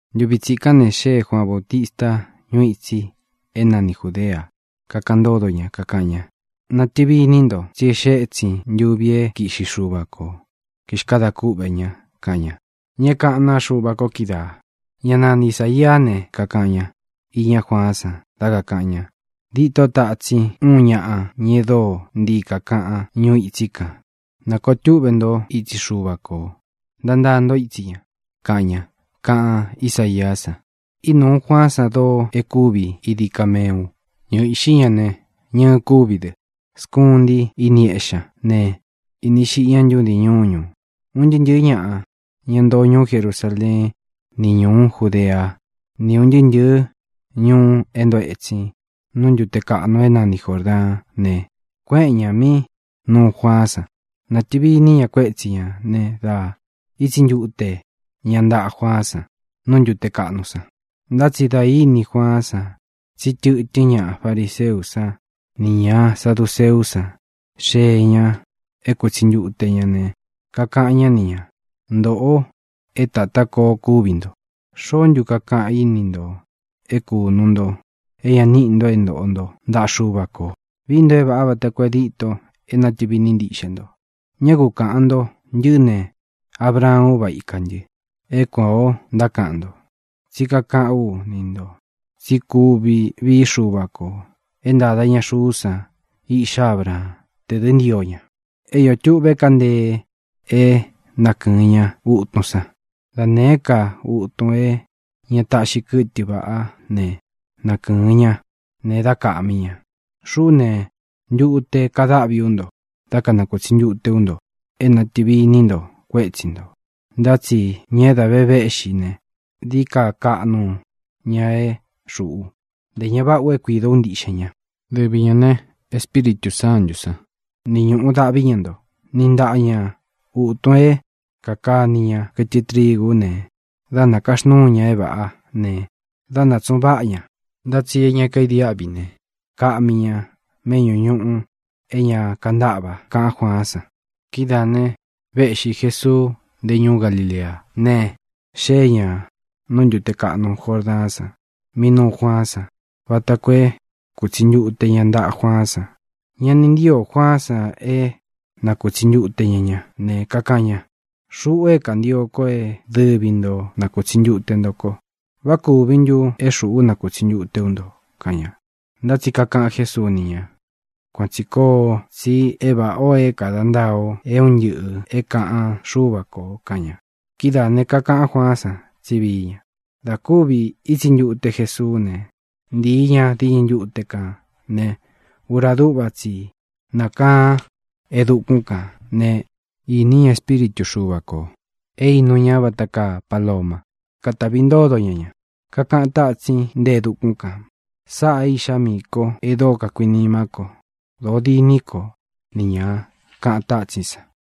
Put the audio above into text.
Ntuvi tsikán ne, xée Juaan Baūtista ñuu itsi é nani Jūdea, kakaꞌan ntódo ña, kakaꞌan ña: —¡Natɨvi iní nto, tsí e xée ētsin ntuvi é kiꞌxi Xuva ko, kixkadā kúꞌvē ña! —kaꞌan ña. Ña é kaꞌán naa Xuva ko kídaā, ñá nani Isāiá ne, kakaꞌan ñá iñá Juaán san dá kākaꞌan ña: Dîtó tatsin úun ñaꞌa, ña e dóo ntii kākaꞌan ñuu itsí kān: “Nakōo túꞌvē ntó itsi Xuva kō; Ntantaa ntó itsi ña”, kaꞌan ña, kaꞌan Ísaiá san. Ínūú Juaán san doo e kúvi idi kameu. Ñɨɨ íꞌxi ña ne, ñɨɨ kúvi dɨ. Skuntí ini éꞌxi ña ne, īni xiꞌi ñá ntudin ñuñu. Un ntɨɨ́ ntɨ̄ɨ́ ñaꞌa, ña ntoo ñuú Jerusaleén ni ñūú Judeá, ni ūn ntɨɨ́ ntɨ̄ɨ́ ñuu é ntoo etsin nú ntūte kaꞌnu é nani Jōrdaán ne, kuéꞌen ñā mí nuu Juaán san. Natɨ̄vi iní ña kuétsi ñā ne, da ítsi ntute ña ntaꞌa Juaán san nú ntute kaꞌnu san. Ntá tsi dā íni Juaán san tsí tɨ̄tɨ́n ña fariseú san nī ña saduceú san xée ñā é kūtsi ntute ña ne, kakaꞌan ñá ni ñā: —¡Ntōꞌo é tatá koo kúvi nto! ¿Xoó ntu kakaꞌan í ni ntō é kūnu nto é ña níꞌi nto é ntoꞌo nto ntaꞌa Xuva kō? Vií nto é vāꞌá vata koo e díto é natɨ̄vi iní ntiꞌxe nto. Ñá ku kaꞌān nto: “Ntɨꞌɨ́ ne, Abraan úva ikā ntɨ”, é kuān o ntákaꞌan nto. Tsí kakaꞌán u ni ntō tsí kuvi vií Xuva kō é ntāda ña xuú san iꞌxá Abraán, tē dɨ́ ntio ña. É iō tuꞌve kaá ntee é nakɨ̄ɨn ña utun san. Da nēé ka utun é ña taꞌxi kɨtɨ vaꞌá ne, nakɨ̄ɨn ña ne, dá kaꞌmi ña. Xuꞌú ne, ntute kadáꞌvi ú nto dá kanakutsi ntute ú nto é nātɨvi iní nto kuétsi ntō, ntá tsi ña é dā vé véꞌxi ne, dií ka kaꞌnu ña é xuꞌu. Ntē ña váꞌa u é kuidō ú ntiꞌxen ñā. Dɨvi ñā ne, Espíritū Sántū san ni ñúꞌu dáꞌvi ña nto. Niꞌi ntaꞌa ña ūtun é kākani ña kɨtɨ trigú ne, dá nākaxnúu ña é vāꞌá ne, dá nātsuꞌun váꞌa ña. Ntá tsi e ña kaidiáꞌvi ne, kaꞌmi ña meꞌñú ñuꞌu é ña kantáꞌva —kaꞌán Juaán san. Kidáā ne, véꞌxi Jēsuu nte ñúú Galileá, ne, xée ñā nú ntute kaꞌnu Jordaán san, mí nuu Juaán san, vata koo é kūtsi ntute ña ntaꞌa Juaán san. Ña ni ntío Juaán san é nakūtsi ntute ña ña, ne, kakaꞌan ña: —Xuꞌu é kantio ko é dɨvi nto nakūtsi ntute nto ko. ¿Vá kūvi ntu é xuꞌú nakūtsi ntute ú nto? —kaꞌan ña. Ntá tsi kakaꞌan Jésuu ni ña: —Kuan tsī koo, tsi é vāꞌá ō é kāda ntaa o é un ntɨꞌɨ̄ é kāꞌan Xúva kō —kaꞌan ña. Kidáā ne, kakaꞌán Juaán san tsí vií ña. Dā kúvi ítsi ntute Jesuú ne, ntii ña diñɨ ntute kān ne, ura dúꞌva tsi i nákaan e dukún kan ne, īní ña Espíritu Xuva kō, é īnu ña vata kaa paloma, kátavi ntódo ña ña. Kakaꞌan tátsin nte e dukún kān: —Sáꞌā é Iꞌxá miī kó e dóo kakuinimá ko. Dōo diní ko ni ñā —kaꞌan tátsín san.